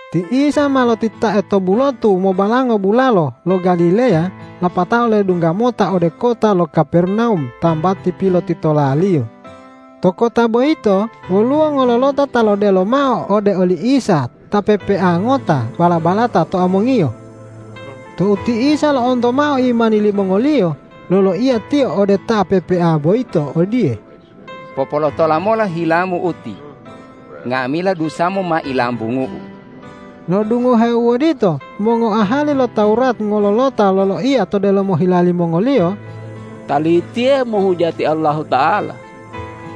Ti Isa ma lotitae to bulotu mobalango bulalo lo Galileya lapatao ledungga mota ode kota lo Kapernawum tambati pilotitola-Liyo. To kota boyito woluwo ngololota ta lodelo mao ode oli Isa ta pepea ngota bala-balata to amongiyo. Tou ti Isa lo'onto mao imani limongoliyo, loloiya Tiyo ode ta pepea boyito odiye,”Popolotola mola hilamu uti. Nga'amila dusamu ma ilambungu-U.” Lo'odungoheo u odito mongoahali lo Tawurat ngololota loloiya to delomo hila limongoliyo,”Talitiye hemohujati Allahuta'ala.”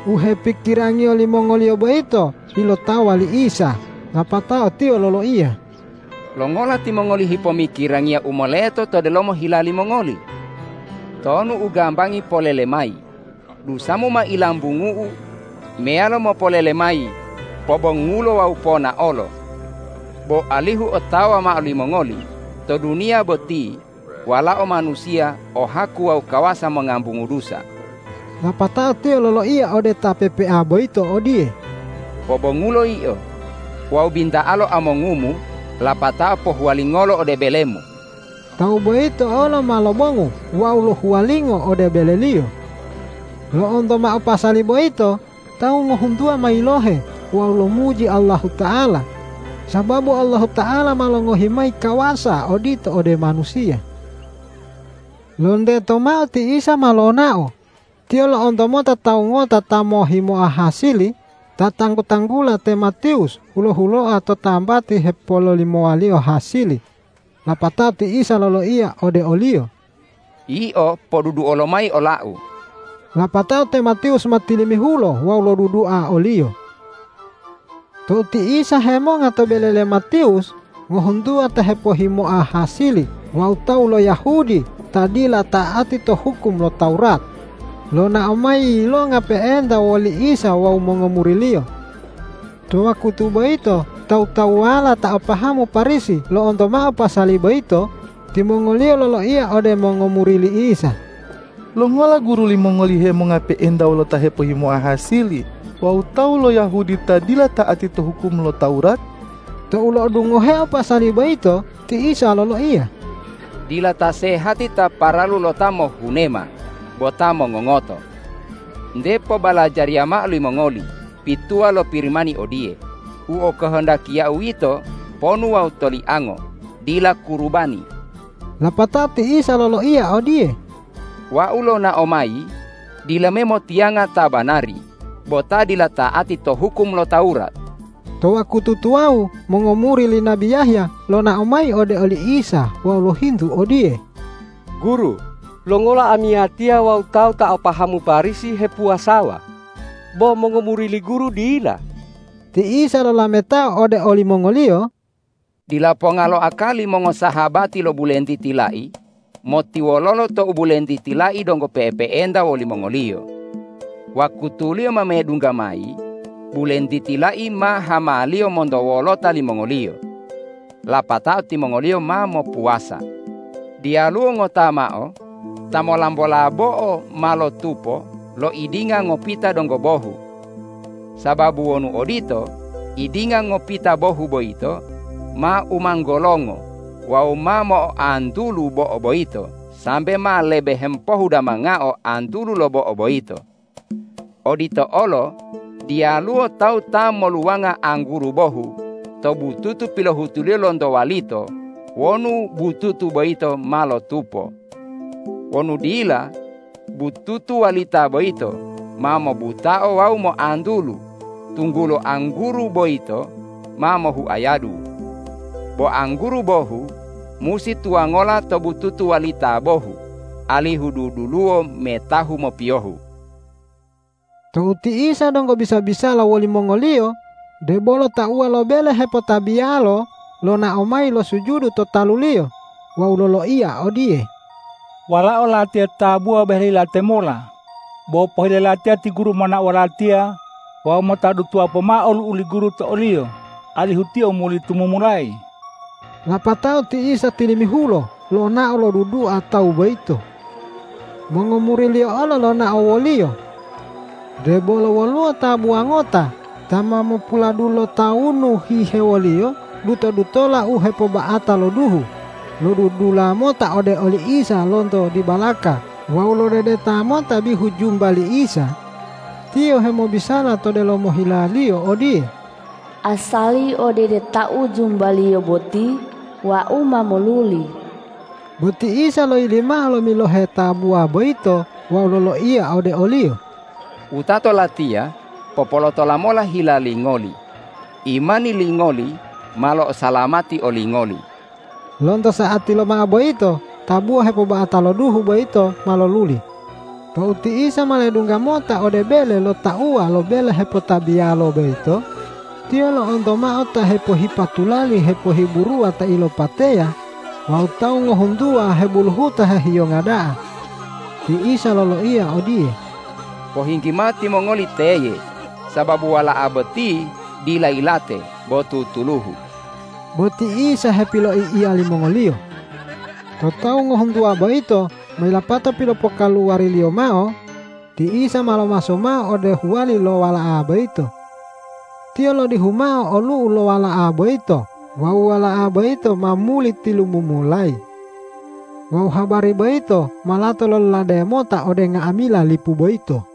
U hepikirangiyo limongoliyo boyito ilotawa li Isa, lapatao Tiyo loloiya,”Longola timongoli hepomikirangiya u moleto to delomo hila limongoli? Tonu u gambangi polele mayi, dusamu ma ilambungu-U, meyalo mopolele mayi, pobongulo wawu ponaolo? Bo alihu otawa mao limongoli, to duniya boti Walao Manusiya o haku wawu kawasa mongambungu dusa.” Lapatao Tiyo loloiya ode ta pepea boyito odiye,”Pobongulo yio wawu binta'alo amongumu lapatao pohuwalingolo ode belemu!” Tawu boyito olo ma lobongu wawu lohuwalingo ode beleliyo. Lo'onto mao pasali boyito tawu ngohuntuwa ma yilohe wawu lomuji Allahuta'ala, sababu Allahuta'ala ma longohi mayi kawasa odito ode manusiya. Lonteto mao ti Isa ma lonao. Tiyo lo'onto mota tawu ngota ta mohhimoa hasili ta tanggu-tanggula te Matiwus hulo-huloa to tambati hepololimowaliyo hasili, lapatao ti Isa loloiya ode oliyo,”Yio poduduo lomayi ola-U.” Lapatao te Matiwus ma tilimihulo wawu lodudua o-Liyo. Tou ti Isa hemonga to bele le Matiwus, ngohuntuwa ta hepohhimoa hasili wawu tawu lo Yahudi ta dila ta'ati to hukum lo Tawurat, lonao mayi yilonga pe'enta woli Isa wawu mongomuri-Liyo. To wakutu boyito tawu-tawuwala ta o pahamu Parisi lo'onto mao pasali boyito, timongoliyo loloiya ode mongomuri li Isa,”Longola Guru limongoli hemonga pe'enta wolo ta hepohhimoa hasili wawu tawu lo Yahudi ta dila ta'ati to hukum lo Tawurat?” Tou lo'odungoheo pasali boyito, ti Isa loloiya,”Dila ta sehati ta paralu lo ta mohhunema bo ta mongongoto. Nte mota pobalajariya mao limongoli pituwa lo Pirimani odiye, ’U okohondakiya-U yito ponu wawu toliango dila kurubani.’” Lapatao ti Isa loloiya odiye,”Wau lonao mayi dila me motiyanga ta banari bo ta dila ta'ati to hukum lo Tawurat.” To wakutu tuwawu mongomuri li nabi Yahya lonao mayi ode oli Isa wawu lohintu odiye,”Guru, longola amiyatiya wawu tawu ta o pahamu Parisi hepuwasawa, bo mongomuri li Guru dila?” Ti Isa lolametao ode olimongoliyo,”Dila ponga lo akali mongosahabati lo bulentiti lai motiwololo tou bulentiti lai donggo pe'epe'enta wolimongoliyo. Wakutuliyo ma medungga mayi, bulentiti lai ma hamaliyo monto wolota limongoliyo. Lapatao timongoliyo ma mopuwasa. Diyaluwo ngota mao ta molambola bo'o ma lotupo lo idinga ngopita donggo bohu. Sababu wonu odito, idinga ngopita bohu boyito ma umanggolongo wawu ma mo'oantulu bo'o boyito sambe ma lebe hemopohudamangao antulu lo bo'o boyito. Odito olo diyaluwo tawu ta moluwanga angguru bohu to bututu pilohutuliyo lonto walito wonu bututu boyito ma lotupo. Wonu dila, bututu walita boyito ma mobutao wawu moantulu, tunggulo angguru boyito ma mohuayadu. Bo angguru bohu musi tuwangola to bututu walita bohu, alihu duduluwo metahu mopiyohu.” Tou ti Isa donggo bisa-bisala wolimongoliyo, debolo tauwa lo bele hepotabiyalo lonao mayi losujudu to talu-Liyo wawu loloiya odiye,”Walao latiya tabuwa boheli yilate mola, bo pohile latiya ti Guru monao wolatiya wawu mota dutuwa pomao olu'u li Guru to oliyo, alihu tiyo muli tumumulayi.” Lapatao ti Isa tilimihulo lonao lodudua tawu boyito. Mongomuri-Liyo olo lonao wo-Liyo. Debolo woluwo tabuwa ngota ta ma mopuladulo tawunu hihewoliyo duto-dutola u hepoba'ata lo duhu lodudula mota ode oli Isa lonto dibalaka wawu lodedeta mota bihu jumba li Isa. Tiyo hemobisala to delomo hilaliyo odiye,”Asali odedetau jumba-Liyo boti wau ma moluli.” Bo ti Isa loyili mao lomilohe tabuwa boyito wawu loloiya ode oliyo,”Wutato Latiya, popolotola mola hila lingoli. Imani lingoli ma lo'osalamati olingoli.” Lonto sa'ati lomao boyito tabuwa hepoba'ata lo duhu boyito ma loluli. Tou ti Isa ma ledungga mota ode bele lo tauwa lo bele hepotabiyalo boyito, Tiyo lo'onto mao ta hepohipa tulali hepohiburuwa ta ilopateya wawu tawu ngohuntuwa hebuluhuta hehiyonga da'a. Ti Isa loloiya odiye,”Pohinggi mao timongoli teye, sababu wala'a boti dila yilate bo tutuluhu.” Bo ti Isa hepiloi'iya limongoliyo. Tou tawu ngohuntuwa boyito ma yilapato pilopokaluwari-Liyo mao, ti Isa ma lomaso mao ode huwali lo wala'a boyito. Tiyo lodihu mao olu'u lo wala'a boyito wawu wala'a boyito ma muli tilumumulayi. Wawu habari boyito ma lato lololade mota ode nga'amila lipu boyito.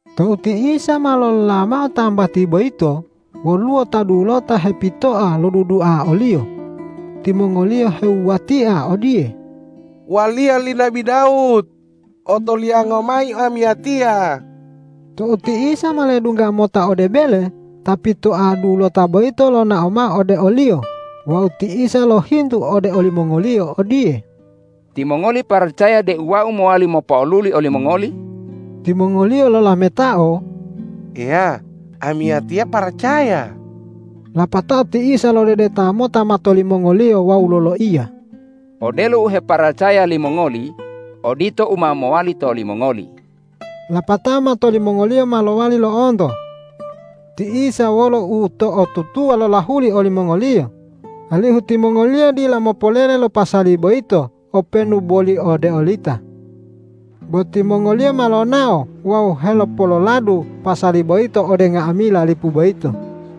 Tou ti Isa ma lolola mao tambati boyito, woluwo ta dulota hepitoa lodudua o-Liyo. Timongoliyo hewuwatia odiye,”Waliya li nabi Dawud, otolianga mayi amiyatiya.” Tou ti Isa ma ledungga mota ode bele, ta pitoa dulota boyito lonao mao ode o-Liyo wawu ti Isa lohintu ode olimongoliyo odiye,”Timongoli paracaya deu Wau mowali mopo'oluli olimongoli?” Timongoliyo lolametao,”Eya, amiyatiya paracaya.” Lapatao ti Isa lodedeta mota mato limongoliyo wawu loloiya,”Odelo u heparacaya limongoli odito u ma mowali to olimongoli.” Lapatao mato limongoliyo ma lowali lo'onto. Ti Isa wolo uto'otutuwa lolahuli olimongoliyo, alihu timongoliyo dila mopolele lo pasali boyito openu boli ode olita. Bo timongoliyo ma lonao wawu helopololadu pasali boyito ode nga'amila lipu boyito.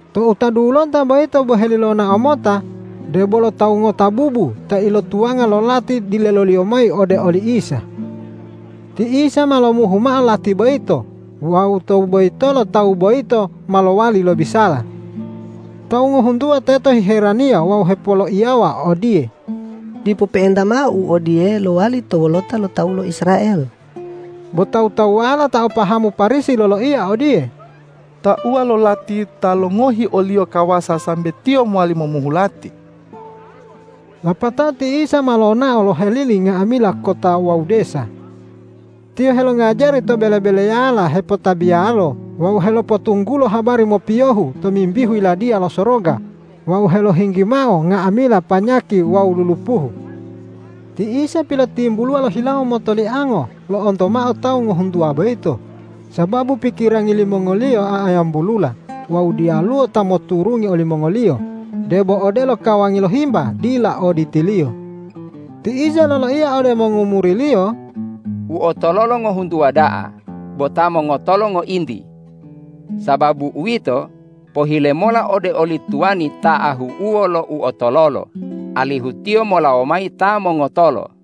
Tou ta dulota boyito boheli lonao mota, debolo tawu ngota bubu ta ilotuwanga lo lati dileloliyo mayi ode oli Isa. Ti Isa ma lomuhu mao lati boyito wawu tou boyitolo tawu boyito ma lowali lobisala. Tawu ngohuntuwa teto hiheraniya wawu hepoloiyawa odiye,”Dipo pe'enta mao u odiye lowali to wolota lo tawu lo Israel.” Bo tawu-tawuwala ta o pahamu Parisi loloiya odiye,”Tauwa lo lati ta longohi o-Liyo kawasa sambe Tiyo mowali momuhu lati.” Lapatao ti Isa ma lonao lohelili nga'amila kota wawu desa. Tiyo helongajari to bele-beleyala hepotabiyalo wawu helopotunggulo habari mopiyohu tomimbihu Yiladiya lo Soroga wawu helohinggi mao nga'amila panyaki wawu lulupuhu. Ti Isa pilotimbuluwa lo hilawo motoliango lo'onto mao tawu ngohuntuwa boyito, sababu pikirangi limongoliyo a'ayambulula wawu diyaluwo ta moturungi olimongoliyo, debo odelo kawangi lo himba dila o ditiliyo. Ti Isa loloiya ode mongomuri-Liyo,”U otololo ngohuntuwa da'a bo ta mongotolo ngointi. Sababu uwito, pohile mola ode oli tuwani ta ahu'uwo lo uotololo, alihu tiyo molawo mayi ta mongotolo.”